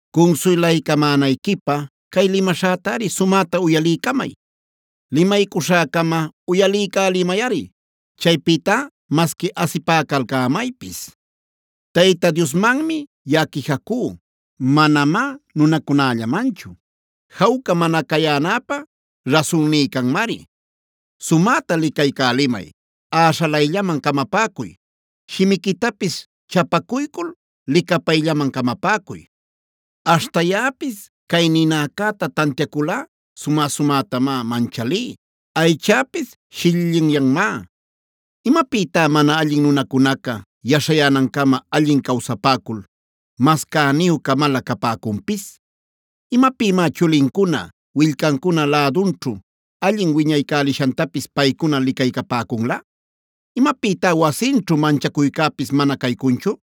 “Cunsuylaycamänayquipä cay limaśhätari sumäta uyaliycamay. Limaycuśhäcama uyaliycälimayꞌari; chaypïtá masqui asipäcalcämaypis. “Tayta Diosmanmi yaꞌa quijacú, manamá nunacunällamanchu. Jawca mana cayänäpä rasunní canmari. Sumäta licaycälimay, äśhalayllaman camapäcuy, shimiquitapis chapacuycul licapayllaman camapäcuy. Aśhta yaꞌapis cay ninäcäta tantiayculꞌa sumä-sumätamá manchalí, aychäpis shillillinyanmá. “¿Imapïtá mana allin nunacunaca yaśhayänancama allin cawsapäcul, mas cäniyu-camalä capäcunpis? ¿Imapïmá chulincuna, willcancuna lädunćhu allin wiñaycälishantapis paycuna licaycapäcunlä? ¿Imapïtá wasinćhu manchacuycäpis mana caycunchu?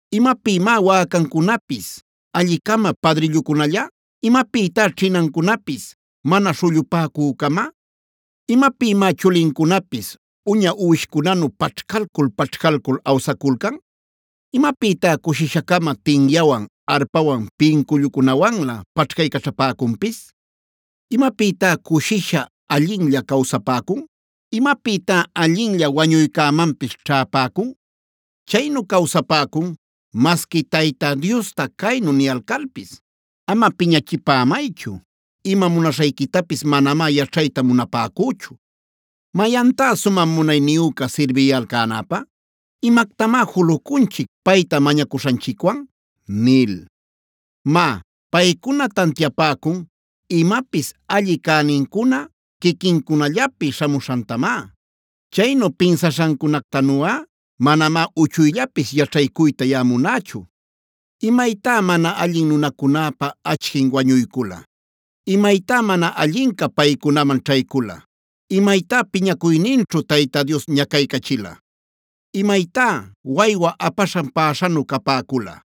¿Imapïmá wäcancunapis alli-cama padrillucunalla? ¿Imapïtá ćhinancunapis mana śhullupäcü-cama? ¿Imapïmá chulincunapis uña uwishcunanu paćhcalcul-paćhcalcul awsaculcan? ¿Imapïtá cushisha-cama tinyawan, arpawan, pincullucunawanlä paćhcaycaćhapäcunpis? ¿Imapïtá cushisha allinlla cawsapäcun? ¿Imapïtá allinlla wañuycämanpis ćhäpäcun? Chaynu cawsapäcun masqui Tayta Diosta caynu niyalcalpis: ‘Ama piñachipämaychu; ima munaśhayquitapis manamá yaćhayta munapäcüchu. ¿Mayantá sumä munayniyüca sirbiyalcänapä? ¿Imactamá julucunchic payta mañacuśhanchicwan?’ Má, paycuna tantiapäcun imapis alli cänincuna quiquincunallapi śhamuśhantamá. Chaynu pinsaśhancunactanuꞌa manamá uchuyllapis yaćhaycuyta yaꞌa munächu. “¿Imaytá mana allin nunacunäpa achquin wañuycula? ¿Imaytá mana allinca paycunaman ćhaycula? ¿Imaytá piñacuyninćhu Tayta Dios ñacaycachila? ¿Imaytá waywa apaśhan päśhanu capäcula?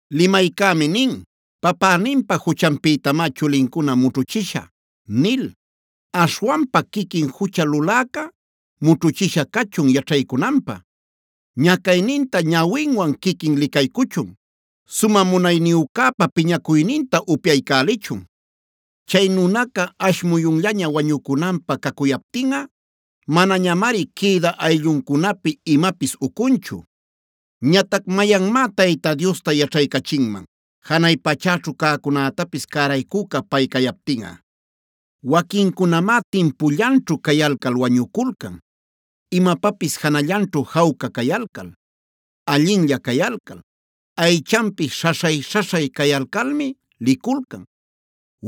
“Limaycämi nin: ‘Papäninpa juchanpïtamá chulincuna mućhuchisha’ nil. Aśhwanpa quiquin jucha luläca mućhuchisha cachun yaćhaycunanpä. Ñacayninta ñawinwan quiquin licaycuchun. Sumä munayniyücäpa piñacuyninta upyaycälichun. Chay nunaca ash muyunllaña wañucunanpä cacuyaptinꞌa, manañamari quïdä aylluncunapi imapis ucunchu. “Ñatac ¿mayanmá Tayta Diosta yaćhaycachinman janay pachäćhu cäcunätapis cäraycüca pay cayaptinꞌa? Waquincunamá timpullanćhu cayalcal wañuculcan; imapapis janallanćhu jawca cayalcal, allinlla cayalcal, aychanpis śhaśhay-śhaśhay cayalcalmi liculcan.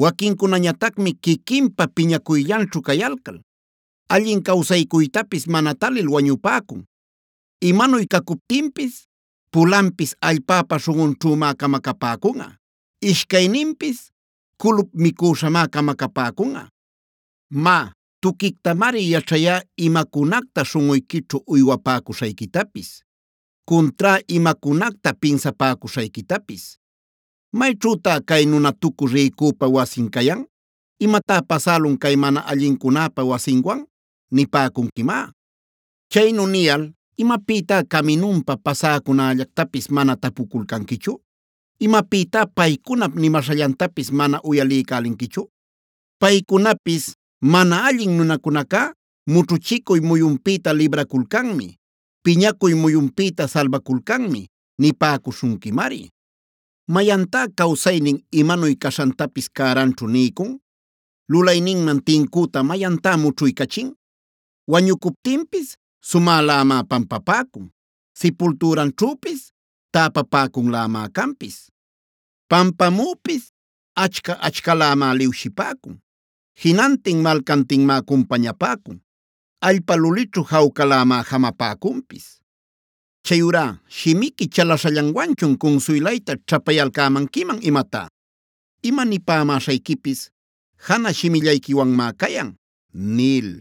Waquincunañatacmi quiquinpa piñacuyllanćhu cayalcal, allin cawsaycuytapis mana talil wañupäcun. Imanuy cacuptinpis pulanpis allpäpa śhunꞌunćhümá camacapäcunꞌa;d ishcayninpis culup micüśhamá camacapäcunꞌa. “Má, tuquictamari yaćhayá imacunacta śhunꞌuyquićhu uywapäcuśhayquitapis; cuntrá imacunacta pinsapäcuśhayquitapis. ‘¿Mayćhütá cay nunatucü rïcüpa wasin cayan? ¿Imatá pasälun cay mana allincunäpa wasinwan?’ nipäcunquimá. Chaynu niyal, ¿imapïtá caminunpa pasäcunällactapis mana tapuculcanquichu? ¿Imapïtá paycunap limaśhallantapis mana uyaliycälinquichu? Paycunapis: ‘Mana allin nunacunacá mućhuchicuy muyunpïta libraculcanmi; piñacuy muyunpïta salbaculcanmi’ nipäcuśhunquimari. ¿Mayantá cawsaynin imanuy caśhantapis cäranćhu niycun? ¿Lulayninman tincüta mayantá mućhuycachin? Wañucuptinpis sumälämá pampapäcun; sipultüranćhüpis täpapäcunlämá canpis. Pampamüpis achca-achcalämá liwshipäcun; jinantin malcantinmá cumpañapäcun, allpa lulićhu jawcalämá jamapäcunpis. “Chayurá ¿shimiqui chalaśhallanwanchun cunsuylayta ćhapayalcämanquiman imatá? Ima nipämäśhayquipis janä shimillayquiwanmá cayan” nil.